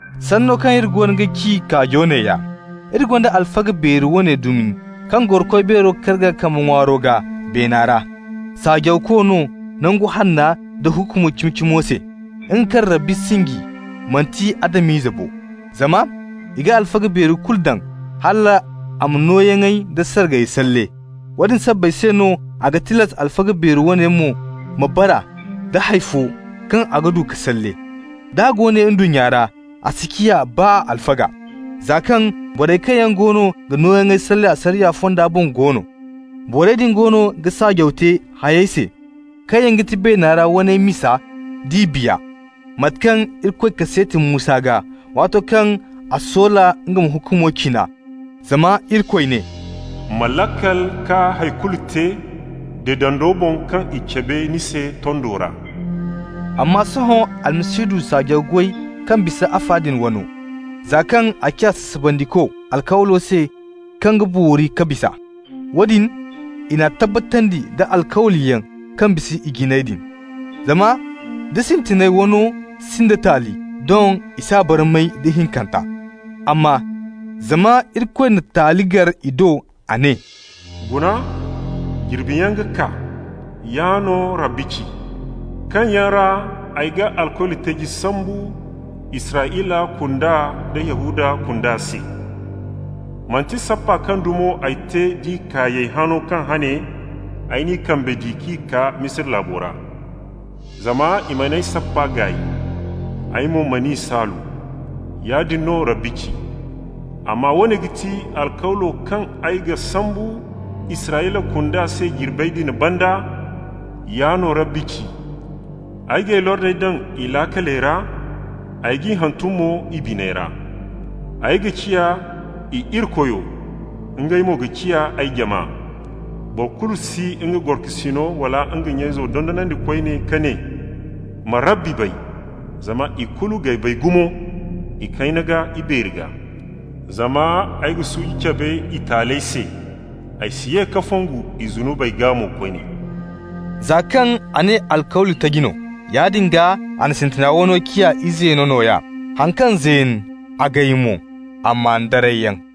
Sanno kaŋ iri goono ga ci kaajo neeya: iri gonda alfaga beeri woone dumi kaŋ goro Koy Beero karga kambe ŋwaaro gaa, beena ra. Saajawko no Nangu Hanna nda hukumo cimi-cimo se, nga kaŋ Rabbi sinji, manti Adam-ize bo. Zama i ga alfaga beeri kulu daŋ hal a ma nooyaŋey da sargayey salle. Woodin sabbay se no a ga tilas alfaga beeri woone mo ma bara nda hay fo kaŋ a ga du ka salle. D'a go ne ndunnya ra, a si ciya baa alfaga, za kaŋ borey kaŋ yaŋ goono ga nooyaŋey salle asariya fonda boŋ go no. Borey din goono ga saajaw te hayey se kaŋ yaŋ ga ti beena ra waney misa d'i biya, mate kaŋ Irikoy kaseeti Musa gaa, waato kaŋ a soola nga ma hukumo cina. Zama Irikoy ne: «Ma laakal ka hay kulu te deedando boŋ kaŋ i cabe ni se tondo ra.» Amma sohõ Almasihu du saajaw goy kaŋ bisa afa din wano, za kaŋ a ciya sasabandiko alkawlo se kaŋ ga boori ka bisa. Woodin i n'a tabbatandi da alkawliyaŋ kaŋ bisa ijiney din. Zama nda sintinay wano sinda taali, doŋ i s'a barmay da ihinkanta. Amma zama Irikoy na taali gar i do, a ne: «Guna, jirbiyaŋ ga kaa, yaa no Rabbi ci: kaŋ yaŋ ra ay ga alkawli taji sambu Israyla kunda da Yahuda kunda se. Manti sappa kaŋ dumo ay te d'i kaayey, hano kaŋ hane ay n'i kambe di k'i kaa Misira laabo ra. Zama i mana ay sappa gaay, ay mo man'i saalu. Yaadin no Rabbi ci. Amma woone ga ti alkawlo kaŋ ay ga sambu Israyla kunda se jirbey din banda, Yaa no Rabbi ci: Ay g'ay lordey daŋ i laakaley ra, Ay g'i hantum mo i biney ra. Ay ga ciya i Irikoyo, ngey mo ga ciya ay jama. Boro kulu si nga gorokasino wala nga nya-izo dondonandi koyne, ka ne: ‹Ma Rabbi bay!› Zama ikulu g'ay bay gumo, ikayna gaa, ibeeri gaa. Zama ay ga suuji cabe i taaley se, ay si ye ka fongu i zunubey gaa mo koyne.» Za kaŋ a ne alkawli taji no -- yaadin gaa a na sintina wano ciya izeeno nooya. Haŋ kaŋ zeen, a gay mo, a maan darayyaŋ.